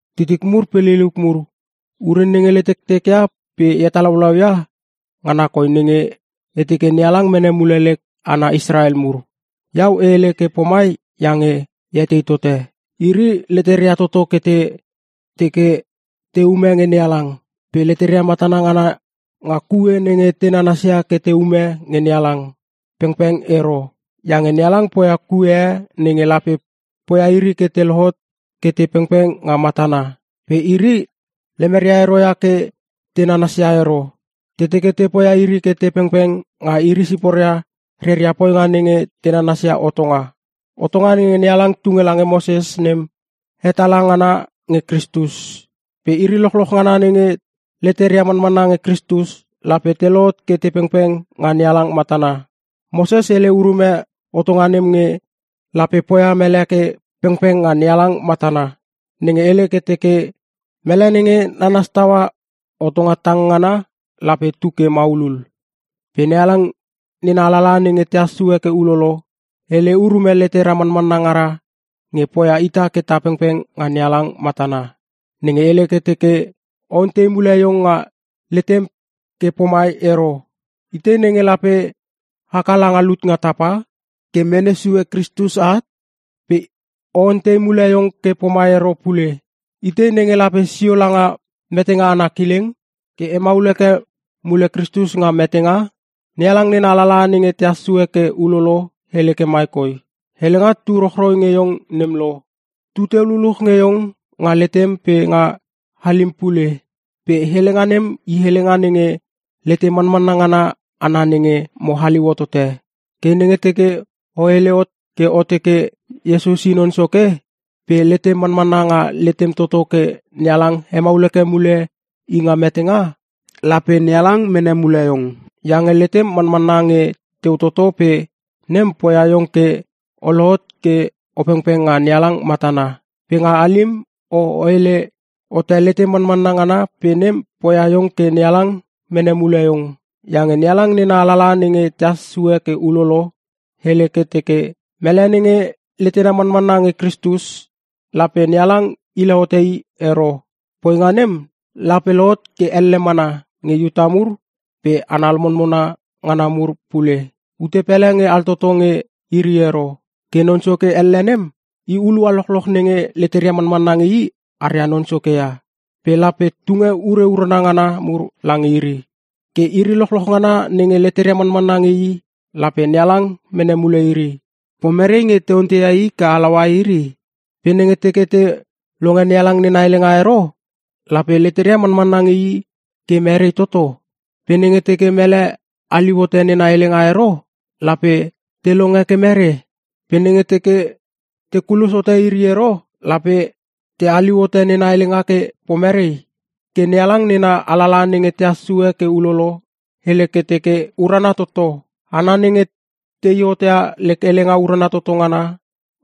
Titik mur pe liliuk mur, ure nenge letektek ia pe e hetalaulau ia, ngana koi nenge e teke NeHalang mene mule lek hana Israel mur. Iau e hele ke pomai iange e etei tote: Iri leteria toto ke te teke te ume nge NeHalang. Pe leteria matana ngana nga kue nenge te nanasia ke te ume nge NeHalang, pengpeng ero. Iange NeHalang poia kue e nenge lape poia iri ke te lohot ke te pengpeng nga matana. Pe iri lemeria ero ia ke te nanasia ero. Te teke te poia iri ke te pengpeng nga iri siporia reria poinga nenge te nanasia hotonga. Hotonga nenge NeHalang tunge lange Moses nem, hetala ngana nge Kristus. Pe iri lochloch ngana nenge leteria manmanna nge Kristus, lape te lohot ke te pengpeng nga NeHalang matana. Moses hele urume hotonga nem nge lape poia mele ke pengpeng nga NeHalang matana: Nenge hele ke teke, “Mele nenge nanas taua hotonga tang ngana lape tu ke maulul.” Pe NeHalang nena alalaha nenge tehas sue ke ulolo, hele urume letera manmanna ngara nge poia ita ke ta pengpeng nga NeHalang matana: Nenge hele ke teke, “O ontei mule iong nga letem ke pomai ero, ‘Itei nenge lape haka langa lut nga tapa?’ (ke mene sue Kristus at) Pe o ontei mule iong ke pomai ero pule, ‘Itei nenge lape sio langa metenga ana kileng?’” (ke hemaul heke mule Kristus nga metenga) NeHalang nena alalaha nenge tehas sue ke ulolo hele ke mai koi, “Helenga tu rochroi nge iong nem lo; tuteu luluch nge iong nga letem pe nga halim pule.” Pe helenga nem i helenga nenge lete manmanna ngana ana nenge mo haliu hotote. Ke nenge teke o hele hot ke o teke, “Iesus i Non Soke,” pe letem manmanna nga letem toto ke NeHalang hemaul heke mule i nga metenga, lape NeHalang mene mule iong. Iange letem manmanna nge teu toto pe nem poia iong ke o lohot ke o pengpeng nga NeHalang matana. Pe nga halim o hele hote letem manmanna ngana pe nem poia iong ke NeHalang mene mule iong. Iange NeHalang nena alalaha nenge tehas sue ke ulolo, hele ke teke, “Mele nenge letena manmanna nge Kristus, lape NeHalang hile hote i ero.” Poinga nem lape lohot ke elle mana nge Iuta mur pe hana lomonmona ngana mur pule. Ute pele nge altoto nge iri ero. Ke Non Soke elle nem, i hulua lochloch nenge leteria mamanna nge i aria Non Soke ia, pe lape tunge ure urana ngana mur lange iri. Ke, “iri lochloch ngana nenge leteria manmanna nge i lape NeHalang mene mule iri.” Pe nenge teke leteria manmanna nge NeHalang ero, pomerei nge te onteia I ke halaua iri? Pe nenge teke te longe NeHalang nena helenga ero, lape leteria manmanna nge I ke merei toto? Pe nenge teke mele haliu hote nena helenga ero, lape te longe ke mere? Pe nenge teke te kulos hote iri ero lape te haliu hote nena helenga ke pomerei? Ke NeHalang nena alalaha nenge tehas sue ke ulolo, hele ke teke, “Urana toto! Hana nenge tei hot ia helenga urana toto ngana,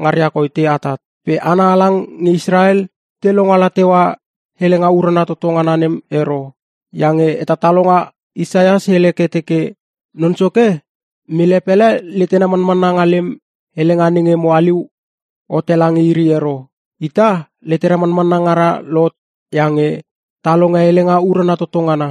ngaria koi te atat!” Pe hana halang nge Israel te longala teua helenga urana toto ngana nem ero. Iange hetatalonga Isaias hele ke teke, “Non Soke, mele pele letena manmanna nga lem helenga nenge mo haliu hote lange iri ero.” Ita, letera manmanna ngara lohot iange ta longe helenga urana toto ngana.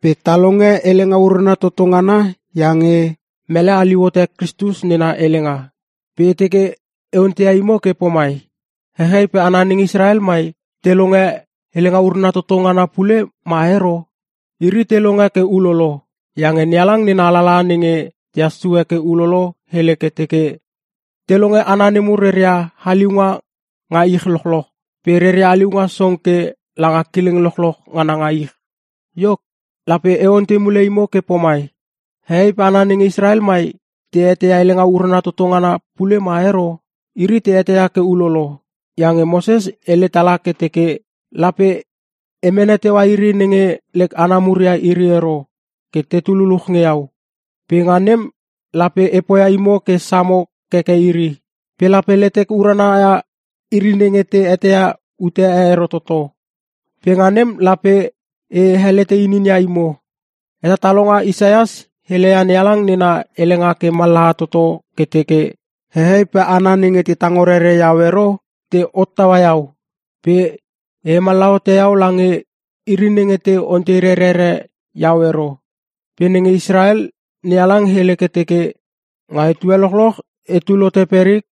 Pe ta longe helenga urana toto ngana iange mele haliu hote Kristus nena helenga. Pe e teke e onteia imo ke pomai: Hehei pe hana nenge Israel mai, te longe helenga urana toto ngana pule ma ero? Iri te longe ke ulolo. Iange NeHalang nena alalaha nenge tehas sue ke ulolo hele ke teke, “Te longe hana nemur reria haliunga nga ich lochloch, pe reria haliunga song ke langa kileng lochloch ngana nga ich.” Iok, lape e ontei mule imo ke pomai: Heei pe hana nenge Israel mai, te eteia helenga urana toto ngana pule ma ero? Iri te eteia ke ulolo. Iange Moses hele tala ke teke, “Lape e mene teua iri nenge lek hana mur ia iri ero ke tetu luluch nge iau, pe nga nem lape e poia imo ke samo keke iri. Pe lape letek urana ia iri nenge te eteia ute e ero toto pe nga nem lape e helete ininia imo.” Hetatalonga Isaias heleia NeHalang nena helenga ke mallaha toto ke teke, “Heei pe hana nenge te tango rerere iau ero, te hottaua iau. Pe e hemallaha hote iau lange iri nenge te ontei rerere iau ero.” Pe nenge Israel, NeHalang hele ke teke, “Nga etue lochloch etul hote perik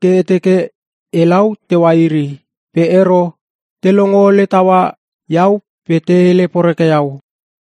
ke e teke elau teua iri. Pe ero, te longo ole taua iau pe te hele poreke iau.”